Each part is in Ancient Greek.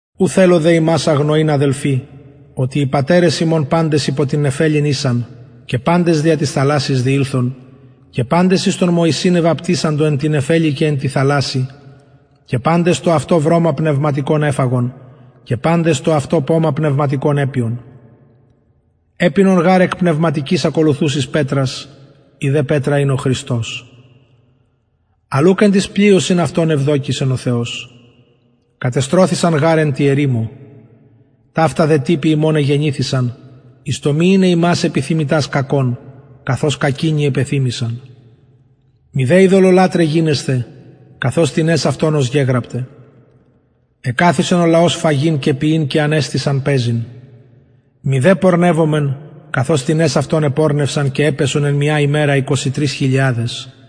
ου θελω δε υμας αγνοειν αδελφοι οτι οι πατερες ημων παντες υπο την νεφελην ησαν και παντες δια της θαλασσης διηλθον και παντες εις τον μωυσην εβαπτισαντο εν τη νεφελη και εν τη θαλασση και παντες το αυτο βρωμα πνευματικον εφαγον και παντες το αυτο πομα πνευματικον επιον επινον γαρ εκ πνευματικης ακολουθουσης πετρας η δε πετρα ην ο χριστος αλλ ουκ εν τοις πλειοσιν αυτων ευδοκησεν ο θεος κατεστρωθησαν γαρ εν τη ερημω ταυτα δε τυποι ημων εγενηθησαν εις το μη ειναι ημας επιθυμητας κακων καθως κακεινοι επεθυμησαν μηδε ειδωλολατραι γινεσθε καθως τινες αυτων ωσπερ γεγραπται εκαθισεν ο λαος φαγειν και πιειν και ανεστησαν παιζειν μηδε πορνευωμεν καθως τινες αυτων επορνευσαν και επεσον εν μια ημερα εικοσι τρεις χιλιαδες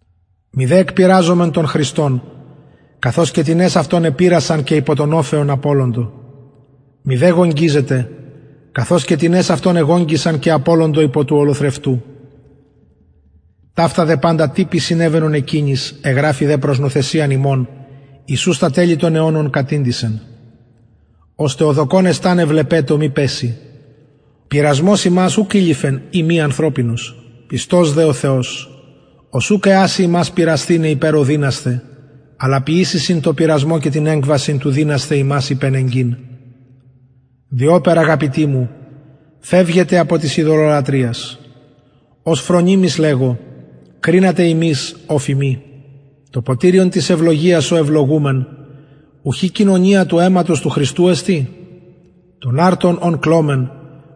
μηδε εκπειραζωμεν τον χριστον καθως και τινες αυτων επειρασαν και υπο των οφεων απωλοντο μηδε γογγυζετε καθως και τινες αυτων εγογγυσαν και απωλοντο υπο του ολοθρευτου ταυτα δε παντα τυποι συνεβαινον εκεινοις εγραφη δε προς νουθεσιαν ημων εις ους τα τελη των αιωνων κατηντησεν ωστε ο δοκων εσταναι βλεπετω μη πεση πειρασμος υμας ουκ ειληφεν ει μη ανθρωπινος πιστος δε ο θεος ος ουκ εασει υμας πειρασθηναι υπερ ο δυνασθε αλλα ποιησει συν τω πειρασμω και την εκβασιν του δυνασθαι υμας υπενεγκειν διοπερ αγαπητοι μου φευγετε απο της ειδωλολατρειας ως φρονιμοις λεγω κρινατε υμεις ο φημι το ποτηριον της ευλογιας ο ευλογουμεν ουχι κοινωνια του αιματος του χριστου εστιν τον αρτον ον κλωμεν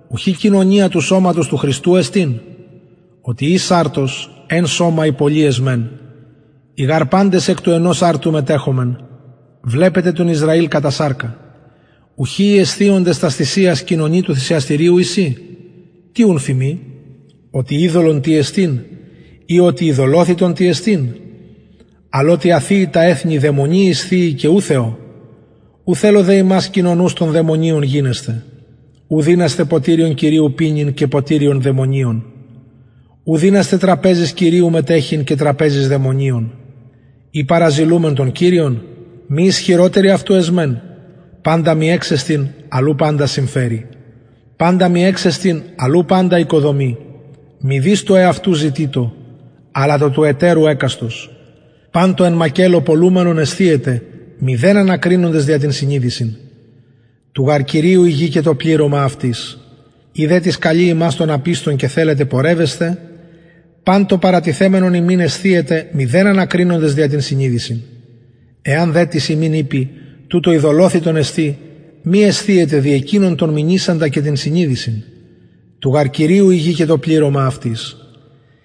ουχι κοινωνια του σωματος του χριστου εστιν οτι εις αρτος εν σωμα οι πολλοι εσμεν οι γαρ παντες εκ του ενος αρτου μετεχομεν βλεπετε τον ισραηλ κατα σαρκα ουχι οι εσθιοντες τας θυσιας κοινωνοι του θυσιαστηριου εισιν τι ουν φημι οτι ειδωλον τι εστιν η οτι ειδωλοθυτον τι εστιν αλλ οτι α θυει τα εθνη δαιμονιοις θυει και ου θεω ου θελω δε υμας κοινωνους των δαιμονιων γινεσθαι ου δυνασθε ποτηριον κυριου πινειν και ποτηριον δαιμονιων ου δυνασθε τραπεζης κυριου μετεχειν και τραπεζης δαιμονιων η παραζηλουμεν τον κυριον μη ισχυροτεροι αυτου εσμεν παντα μοι εξεστιν αλλ ου παντα συμφερει παντα μοι εξεστιν αλλ ου παντα οικοδομει μηδεις το εαυτου ζητειτω αλλα το του ετερου εκαστος παν το εν μακελλω πωλουμενον εσθιετε μηδεν ανακρινοντες δια την συνειδησιν του γαρ κυριου η γη και το πληρωμα αυτης ει δε τις καλει υμας των απιστων και θελετε πορευεσθαι παν το παρατιθεμενον υμιν εσθιετε μηδεν ανακρινοντες δια την συνειδησιν εαν δε τις υμιν ειπη τουτο ειδωλοθυτον εστιν μη εσθιετε δι εκεινον τον μηνυσαντα και την συνειδησιν του γαρ κυριου η γη και το πληρωμα αυτης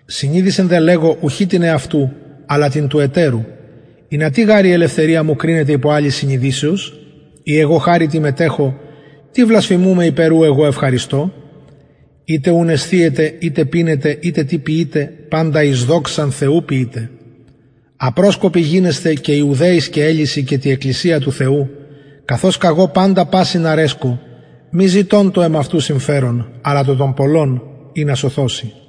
συνειδησιν δε λεγω ουχι την εαυτου αλλα την του ετερου ινα τι γαρ η ελευθερια μου κρινεται υπο αλλης συνειδησεως ει εγω χαριτι μετεχω τι βλασφημουμαι υπερ ου εγω ευχαριστω ειτε ουν εσθιετε ειτε πινετε ειτε τι ποιειτε παντα εις δοξαν θεου ποιειτε απροσκοποι γινεσθε και ιουδαιοις και ελλησιν και τη εκκλησια του θεου καθως καγω παντα πασιν αρεσκω μη ζητων το εμαυτου συμφερον αλλα το των πολλων ινα σωθωσιν